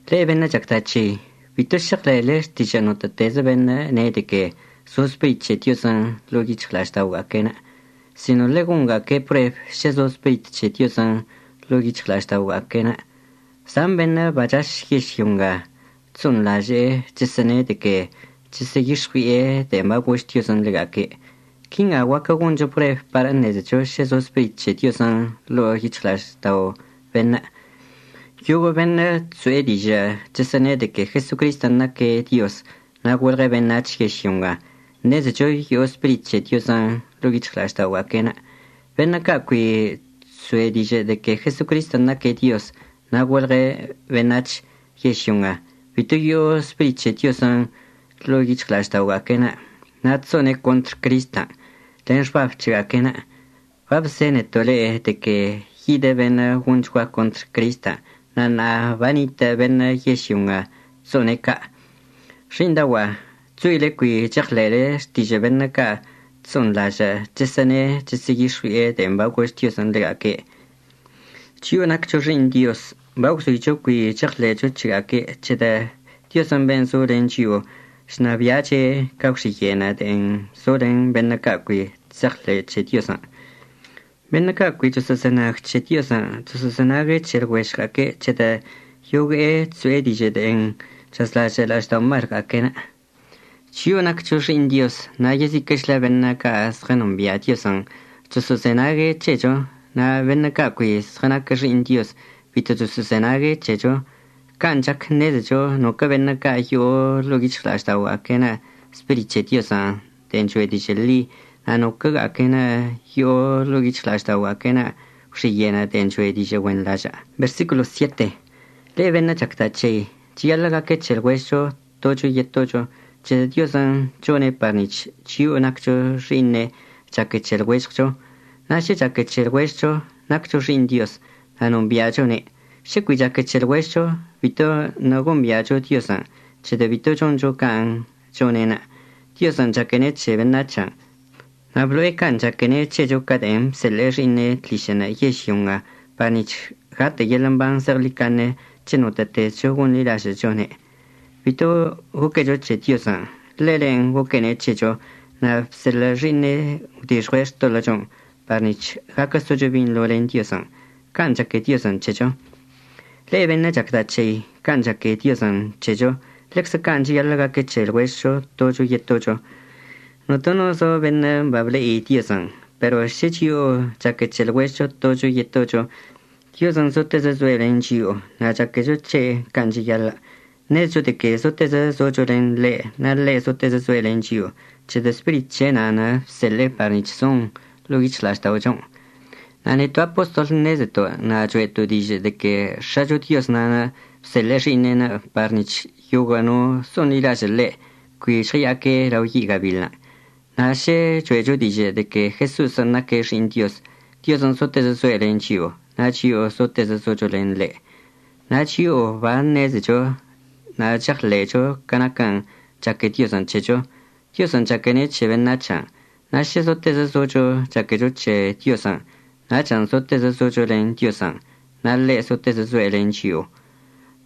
Le'e beṉə' chacda' c̱hei, bito šeɉḻe'ele xtižə' notə'ətezə beṉə' ne' de que zo Spirit c̱he Diozən' ḻo'o yic̱hɉla'aždaogüe'enə', sino ḻegonga'aque' prueb šə zo Spirit c̱he Diozən' ḻo'o yic̱hɉla'ažda'oga'aque'enə'. Zan beṉə' bachaš yežlyo nga chso'onḻaže'e chəsə'əne' de que chəsə'əyix̱ɉui'e de'en bagož Diozən' ḻega'aque'. Quinga guaquə goncho prueb par əṉezecho šə zo Spirit c̱he Diozən' ḻo'o yic̱hɉla'aždao' beṉə': Yoguə' beṉə' chso'e dižə' chəsə'əne' de que Jesocristən' naque' Dioz na' golɉe' beṉac̱h yežlyo nga, ṉezecho yo'o Spirit c̱he Diozən' ḻo'o yic̱hɉla'ažda'oga'aque'enə'. Beṉə' ca' cui chso'e dižə' de que Jesocristən' naque' Dioz na' golɉe' beṉac̱h yežlyo nga, bito yo'o Spirit c̱he Diozən' ḻo'o yic̱hɉla'ažda'oga'aque'enə' na' chso'one' contr Cristən' len xbab c̱hega'aque'enə'. Babzeneto' le'e de que yidə beṉə' gonchgua contr Cristən', na' ṉa'a banitə' beṉə' yežlyo nga chso'one' ca'. Xi'iṉdaogua'a chzoile cui cheɉḻe'ele xtižə' beṉə' ca' chso'onḻažə' chəsə'əne' chəsə'əyix̱ɉui'e de'en bagož Diozən' ḻega'aque'. Chio'o naccho xi'iṉ Dioz bagwzoicho cui cheɉḻe'echo c̱hega'aque' c̱hedə' Diozən' ben' zo len chio'o chnabi'ache' ca gwxiye'enə' de'en zo len beṉə' ca' cui chse'eɉḻe'e c̱he Diozən'. Beṉə' ca' cui choso'ozenag c̱he Diozən' choso'ozenague' c̱he lɉuežɉga'aque' c̱hedə' yogue'e chso'e dižə' de'en chazlažə' la'ažda'omalga'aque'enə'. Chio'o naccho xi'iṉ Dioz na' yeziquə'əchlə beṉə' ca' zɉənombia' Diozən' choso'ozenague' c̱hecho, na' beṉə' ca' cui zɉənaquə xi'iṉ Dioz bito choso'ozenague' c̱hecho. Can' chac ṉezecho noquə' beṉə' ca' yo'o ḻo'o yic̱hɉla'ažda'oga'aque'enə' Spirit c̱he Diozən' de'en choe' dižə' ḻi na' noquə'əga'aque'enə' yo'o ḻo'o yic̱hɉla'ažda'oga'aque'enə' gwxiye'enə' de'en choe' dižə' güenḻažə'. Le'e beṉə' chacda' c̱hei, cheyaḻə' gaque c̱he lɉuežɉcho tocho yetocho c̱hedə' Diozən' chone' par nic̱h chio'o naccho xi'iṉe' chaque c̱he lɉuežɉcho. Na' šə chaque c̱he lɉuežɉcho naccho xi'iṉ Dioz na' nombi'achone'. Šə cui chaque c̱he lɉuežɉcho, bitoṉə' gombi'acho Diozən' c̱hedə' bito choncho can' chone'enə'. Diozən' chaquene' c̱he beṉac̱hən'. Na' blo'e can' chaquene' c̱hecho ca de'en bseḻe'e Xi'iṉe' tlišə'ənə' yežlyo nga par nic̱h gatə' yeḻə' mban zeɉḻicaṉe c̱he notə'ətezcho gonḻilažə'əchone'. Bito goquecho c̱he Diozən', ḻelen' goquene' c̱hecho na' bseḻə' Xi'iṉe'enə' gwdixɉue' xtoḻə'əchon' par nic̱h gaquə socho binḻo len Diozən'. Can' chaque Diozən' c̱hecho. Le'e beṉə' chacda' c̱hei, can' chaque Diozən' c̱hecho, ḻeczə can' cheyaḻə' gaque c̱he lɉuežɉcho tocho yetocho. Notono zo beṉə' bable'ine' Diozən'. Pero šə chio'o chaque c̱he lɉuežɉcho tocho yetocho, Diozən' zotezə zoe' len chio'o na' chaquecho c̱he' can' cheyaḻə'. Ṉezecho de que zotezə zocho len ḻe' na' ḻe' zotezə zoe' len chio'o c̱hedə' Spirit c̱he' nan' bseḻe'e par nic̱h zon ḻo'o yic̱hɉla'ažda'ochon'. Na' neto' apostol ṉezeto' na' cho'eto' dižə' de que X̱acho Dioz na'anə' bseḻə' Xi'iṉe'enə' par nic̱h yoguə' no so'onḻilažə' ḻe' cui žɉəya'aque' lao yi' gabiḻən'. Na' šə cho'echo dižə' de que Jeso'osən' naque' Xi'iṉ Dioz, Diozən' zotezə zoe' len chio'o na' chio'o zotezə zocho len ḻe'. Na' chio'o baṉezecho na' cheɉḻe'echo ca naquən' chaque Diozən' c̱hecho. Diozən' chaquene' c̱he beṉac̱hən' na' šə zotezə zocho chaquecho c̱he Diozən', nachən' zotezə zocho len Diozən' na' ḻe' zotezə zoe' len chio'o.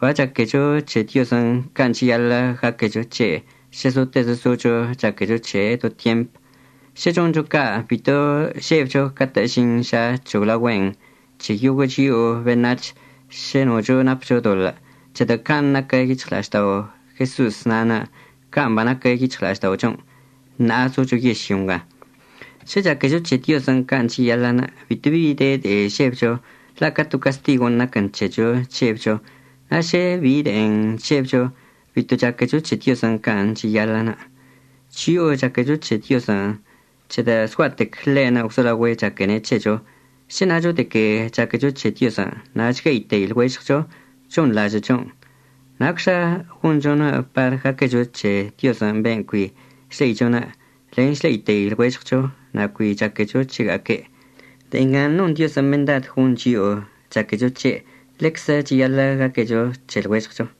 Bachaquecho c̱he Diozən' can' cheyaḻə' gaquecho c̱he' šə zotezə zocho chaquecho c̱he' do tyemp. Šə choncho ca' bito žebcho catə' əžin ža c̱hoglaogüe'en c̱he yoguə' chio'o beṉac̱h šə nocho napcho doḻə', c̱hedə' can' naquə yic̱hɉla'aždao' Jeso'os na'anə' can' banaquə yic̱hɉla'ažda'ochon' ṉa'a zocho yežlyo nga. Šə chaquecho c̱he Diozən' can' cheyaḻə'ənə' bito bi de de'e žebcho, la' ca to castigon' naquən c̱hecho chžebcho. Na' šə de bi de'e chžebcho, bito chaquecho c̱he Diozən' can' cheyaḻə'ənə'. Chio'o chaquecho c̱he Diozən' c̱hedə' zgua'atec ḻe'enə' gwzolaogüe' chaquene' c̱hecho. Šə nacho de que chaquecho c̱he Diozən' na' chgue'itei lɉuežɉcho, chonḻažə'əchonə'. ¿Nacxa gonchonə' par gaquecho c̱he Diozən' ben' cui chle'icho? len chle'itei lɉuežɉcho na' cui chaquecho chega'aque'. De'e ngan' non Diozən' mendad gon chio'o chaquecho c̱he', ḻeczə cheyaḻə' gaquecho c̱he lɉuežɉcho.